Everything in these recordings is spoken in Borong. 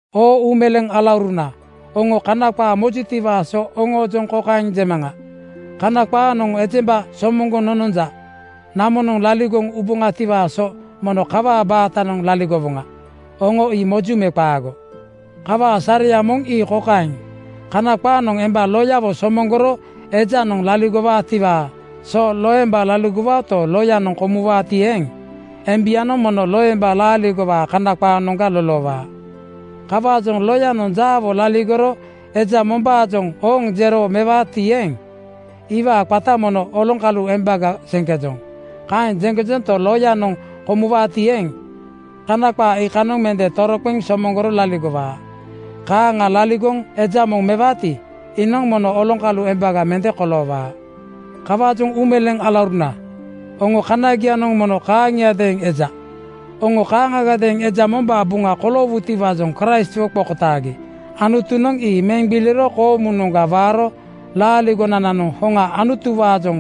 Oo uumeleeŋ alauruna, oŋo Kana qaa mojutiwaa so oŋoojoŋ kokaeŋ jemaŋa: Kana qaanoŋ ejemba somoŋgoŋ nononja. Namonoŋ laligoŋ uboŋatiwaa so mono kawaa baatanoŋ laligowoŋa, oŋo ii moju me qaago? Kawaa sareya moŋ ii kokaeŋ: Kana qaanoŋ emba loyawo somoŋgoro ejanoŋ laligowaatiwaa so loemba laligowaoto, loyanoŋ komuwaati eeŋ, embianoŋ mono loemba laaligowaa Kana qaanoŋga loloowaa. Kawaajoŋ loyanoŋ jaawo laligoro eja mombaajoŋ Ooŋ jero mewaati eeŋ, iwaa qata mono oloŋkalu embaga jeŋkejoŋ. Kaeŋ jeŋkejonto, loyanoŋ komuwaati eeŋ, Kana qaa iikanoŋ mende toroqeŋ somoŋgoro laligowaa. Kaaŋa laligoŋ eja moŋ mewaati, iinoŋ mono oloŋkalu embaga mende koloowaa. Kawaajoŋ uumeleeŋ alauruna, oŋoo kanagianoŋ mono kaaŋiadeeŋ eja. Oŋo kaaŋagadeeŋ eja mombaa buŋa koloowutiwaajoŋ Kraistwo qokotaagi. Anutunoŋ ii meŋ gbiliro koomunoŋga waaro laaligonananoŋ hoŋa Anutuwaajoŋ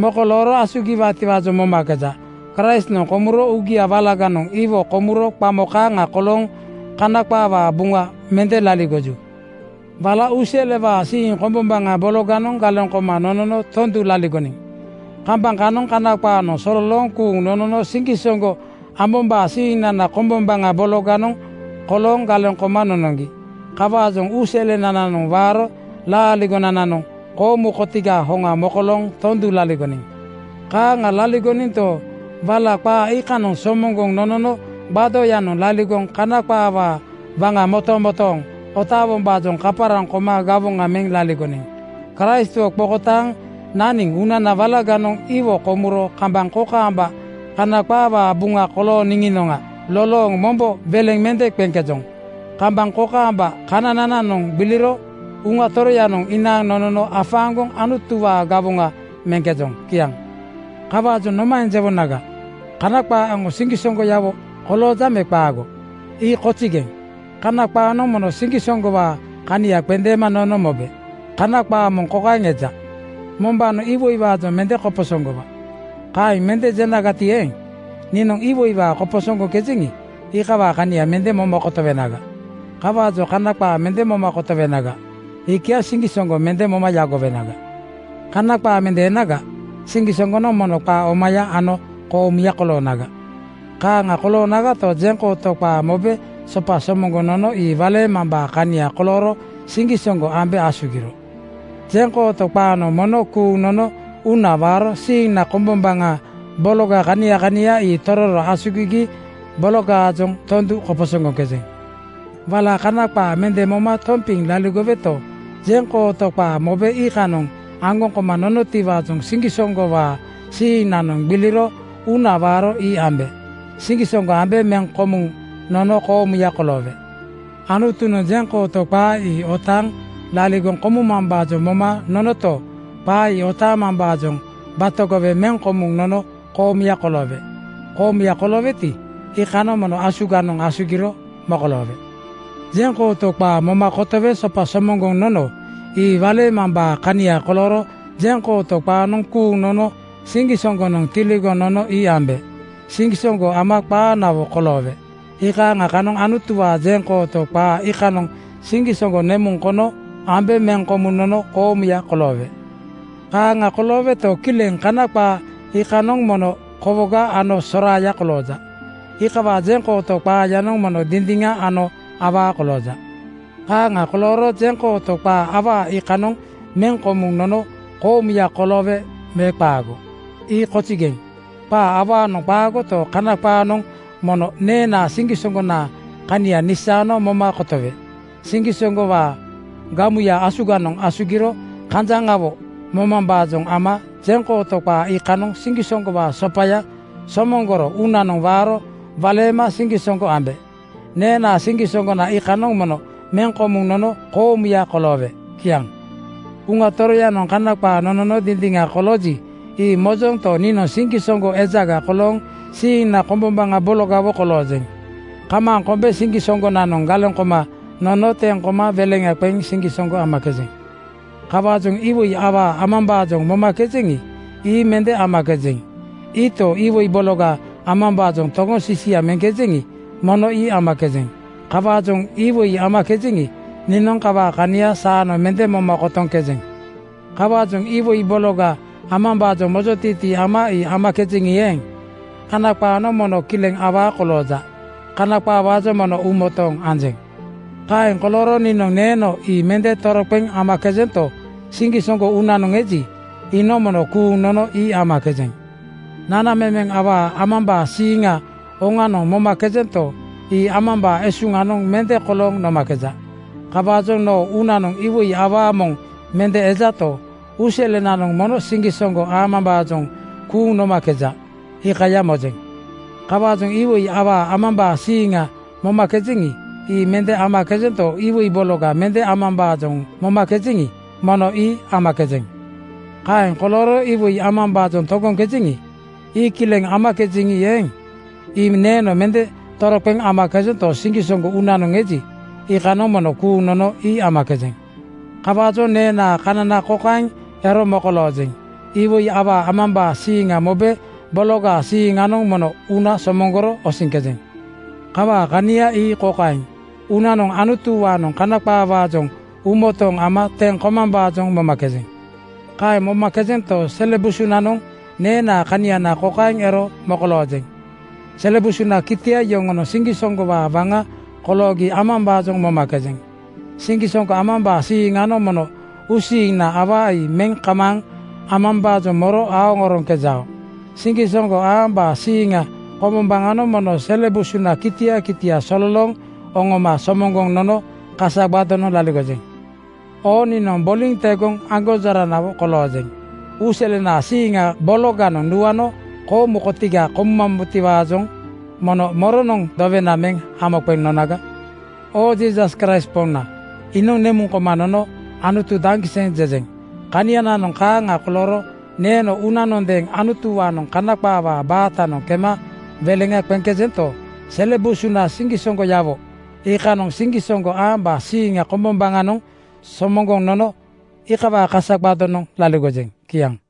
mokolooro asugiwaatiwaajoŋ momakeja. Kraistnoŋ komuro uugia walaganoŋ iwo komuro qamo kaaŋa kolooŋ Kana qaawaa buŋa mende laligoju. Wala uuselewaa siiŋ kombombaŋa bologanoŋ galeŋ koma nonono tondu laligoniŋ. Kambaŋ kanoŋ Kana qaanoŋ sololooŋ kuuŋ nonono siŋgisoŋgo ambombaa siiŋnana kombombaŋa bologanoŋ kolooŋ galeŋ koma nonoŋgi. Kawaajoŋ uuselenananoŋ waaro laaligonananoŋ koomu kotigaa hoŋa mokolooŋ tondu laligoniŋ. Kaaŋa laligoninto, wala qaa iikanoŋ somoŋgoŋ nonono gbadoyanoŋ laligoŋ kana qaawaa waŋa motomotooŋ otaawombaajoŋ kaparaŋ koma gawoŋa meŋ laligoniŋ. Kraistwo qokotaaŋ naniŋ uunana walaganoŋ iwo komuro kambaŋ kokaamba kana qaawaa buŋa kolooniŋinoŋa lolooŋ mombo weleŋa mende qeŋkejoŋ. Kambaŋ kokaamba kananananoŋ gbiliro Uŋa Toroyanoŋ inaaŋ nonono afaaŋgoŋ Anutuwaa gawoŋa meŋkejoŋ. Kiaŋ. Kawaajoŋ nomaeŋ jewonaga? Kana qaa aŋo siŋgisoŋgoyawo kolooja me qaago? Ii kozigeŋ! Kana qaanoŋ mono siŋgisoŋgowaa kania qendeema nono mobe. Kana qaa moŋ kokaeŋ eja, “Mombaanoŋ iwoiwaajoŋ mende koposoŋgowa.” Kaeŋ mende jenagati eeŋ, niinoŋ iwoiwaa koposoŋgoŋkejeŋi, iikawaa kania mende moma kotowenaga. Kawaajoŋ Kana qaa mende moma kotowenaga, iikiaŋ siŋgisoŋgo mende moma yagowenaga. Kana qaa mende enaga, siŋgisoŋgonoŋ mono qaa omaya ano koomuya koloonaga. Kaaŋa koloonagato, jeŋkooto qaa mobe sopa somoŋgoŋ nono ii waleemambaa kania kolooro siŋgisoŋgo ambe asugiro. Jeŋkooto qaanoŋ mono kuuŋ nono uuna waaro siiŋna kombombaŋa bologa kania kania ii tororo asugigi bologaajoŋ tondu koposoŋgoŋkejeŋ. Wala Kana qaa mende moma tompiŋ laligoweto, jeŋkooto qaa mobe iikanoŋ aŋgoŋ koma nonotiwaajoŋ siŋgisoŋgowaa siiŋnanoŋ gbiliro uuna waaro ii ambe. Siŋgisoŋgo ambe meŋ komuŋ nono koomuya koloowe. Anutunoŋ jeŋkooto qaa ii otaaŋ laligoŋ kotiimambaajoŋ moma nonoto, qaa ii otaamambaajoŋ batogowe meŋ komuŋ nono koomuya koloowe. Koomuya kolooweti, iikanoŋ mono asuganoŋ asugiro mokoloowe. Jeŋkooto qaa moma kotowe sopa somoŋgoŋ nono ii waleemambaa kania kolooro jeŋkooto qaanoŋ kuuŋ nono siŋgisoŋgonoŋ tiligoŋ nono ii ambe. Siŋgisoŋgo ama qaanawo koloowe. Iikaaŋa kanoŋ Anutuwaa jeŋkooto qaa iikanoŋ siŋgisoŋgo nemuŋ kono ambe meŋ komuŋ nono koomuya koloowe. Kaaŋa kolooweto, kileŋ Kana qaa iikanoŋ mono kowoga ano soraaya kolooja. Iikawaa jeŋkooto qaayanoŋ mono dindiŋa ano awaa kolooja. Kaaŋa kolooro jeŋkooto qaa awaa iikanoŋ meŋ komuŋ nono koomuya koloowe me qaago? Ii kozigeŋ! Qaa awaanoŋ qaagoto, Kana qaanoŋ mono neenaa siŋgisoŋgonaa kania nisaano moma kotowe. Siŋgisoŋgowaa gamuya asuganoŋ asugiro kanjaŋawo momambaajoŋ ama jeŋkooto qaa iikanoŋ siŋgisoŋgowaa sopaya somoŋgoro uunanoŋ waaro waleema siŋgisoŋgo ambe. Neenaa siŋgisoŋgona iikanoŋ mono meŋ komuŋ nono koomuya koloowe. Kiaŋ. Uŋa Toroyanoŋ Kana qaa nonono dindiŋa kolooji, ii mojonto, niinoŋ siŋgisoŋgo ejaga kolooŋ siiŋna kombombaŋa bologawo koloojeŋ. Kamaaŋ kombe siŋgisoŋgonoŋ galeŋ koma nono teŋ koma weleŋa qeŋ siŋgisoŋgo amakejeŋ. Kawaajoŋ iwoi awaa amambaajoŋ momakejeŋi, ii mende amakejeŋ. Iito, iwoi bologa amambaajoŋ togoŋ sisia meŋkejeŋi, mono ii amakejeŋ. Kawaajoŋ iwoi amakejeŋi, niinoŋ kawaa kania saanoŋ mende moma kotoŋkejeŋ. Kawaajoŋ iwoi bologa amambaajoŋ mojotiitii ama ii amakejeŋi eeŋ, Kana qaanoŋ mono kileŋ awaa kolooja. Kana qaawaajoŋ mono uumotooŋ anjeŋ. Kaeŋ kolooro niinoŋ neeno ii mende toroqeŋ amakejento, siŋgisoŋgo uunanoŋ eji, iinoŋ mono kuuŋ nono ii amakejeŋ. Nanamemeŋ awaa amambaa siiŋa oŋanoŋ momakejento, ii amambaa esunanoŋ mende kolooŋ nomakeja. Kawaajoŋ noo uunanoŋ iwoi awaa moŋ mende ejato, uuselenanoŋ mono siŋgisoŋgo amambaajoŋ kuuŋ nomakeja, iikaya mojeŋ. Kawaajoŋ iwoi awaa amambaa siiŋa momakejeŋi, ii mende amakejento, iwoi bologa mende amambaajoŋ momakejeŋi, mono ii amakejeŋ. Kaeŋ kolooro iwoi amambaajoŋ togoŋkejeŋi, ii kileŋ amakejeŋi eeŋ, ii neeno mende toroqeŋ amakejento, siŋgisoŋgo uunanoŋ eji, iikanoŋ mono kuuŋ nono ii amakejeŋ. Kawaajoŋ neenaa kanana kokaeŋ ero mokolooŋkejeŋ: Iwoi awaa amambaa siiŋa mobe bologaa siiŋanoŋ mono uuna somoŋgoro osiŋkejeŋ. Kawaa kania ii kokaeŋ: Uunanoŋ Anutuwaanoŋ Kana qaawaajoŋ uumotooŋ ama teŋ komambaajoŋ momakejeŋ. Kaeŋ momakejento, sele busunanoŋ neenaa kaniana kokaeŋ ero mokolooŋkejeŋ: sele busunaa kitia yoŋonoŋ siŋgisoŋgowaa waŋa koloogi amambaajoŋ momakejeŋ. Siŋgisoŋgo amambaa siiŋnanoŋ mono uusiiŋna awaa ii meŋ kamaaŋ amambaajoŋ moro aoŋ oroŋkejao. Siŋgisoŋgo amambaa siiŋna kombombaŋanoŋ mono sele busunaa kitia kitia sololooŋ oŋoma somoŋgoŋ nono kasa gbadonoŋ laligojeŋ. Oo niinoŋ boliŋ tegoŋ aŋgonjoranawo koloojeŋ. Uuselenaa siiŋa bologanoŋ nuano koomu kotiga komumambotiwaajoŋ mono moronoŋ dowena meŋ hamo qeŋ nonaga? Oo Jiisas Kraist Poŋna, iinoŋ nemuŋ koma nono “Anutu daŋgiseŋ!” jejeŋ. Kaniananoŋ kaaŋa kolooro neeno uunanondeeŋ Anutuwaanoŋ Kana qaawaa baatanoŋ kema weleŋa qeŋkejento, sele busuna siŋgisoŋgoyawo iikaaŋanoŋ siŋgisoŋgo amambaa siiŋna kombombaŋanoŋ somoŋgoŋ nono iikawaa kasa gbadonoŋ laligojeŋ. Kiaŋ.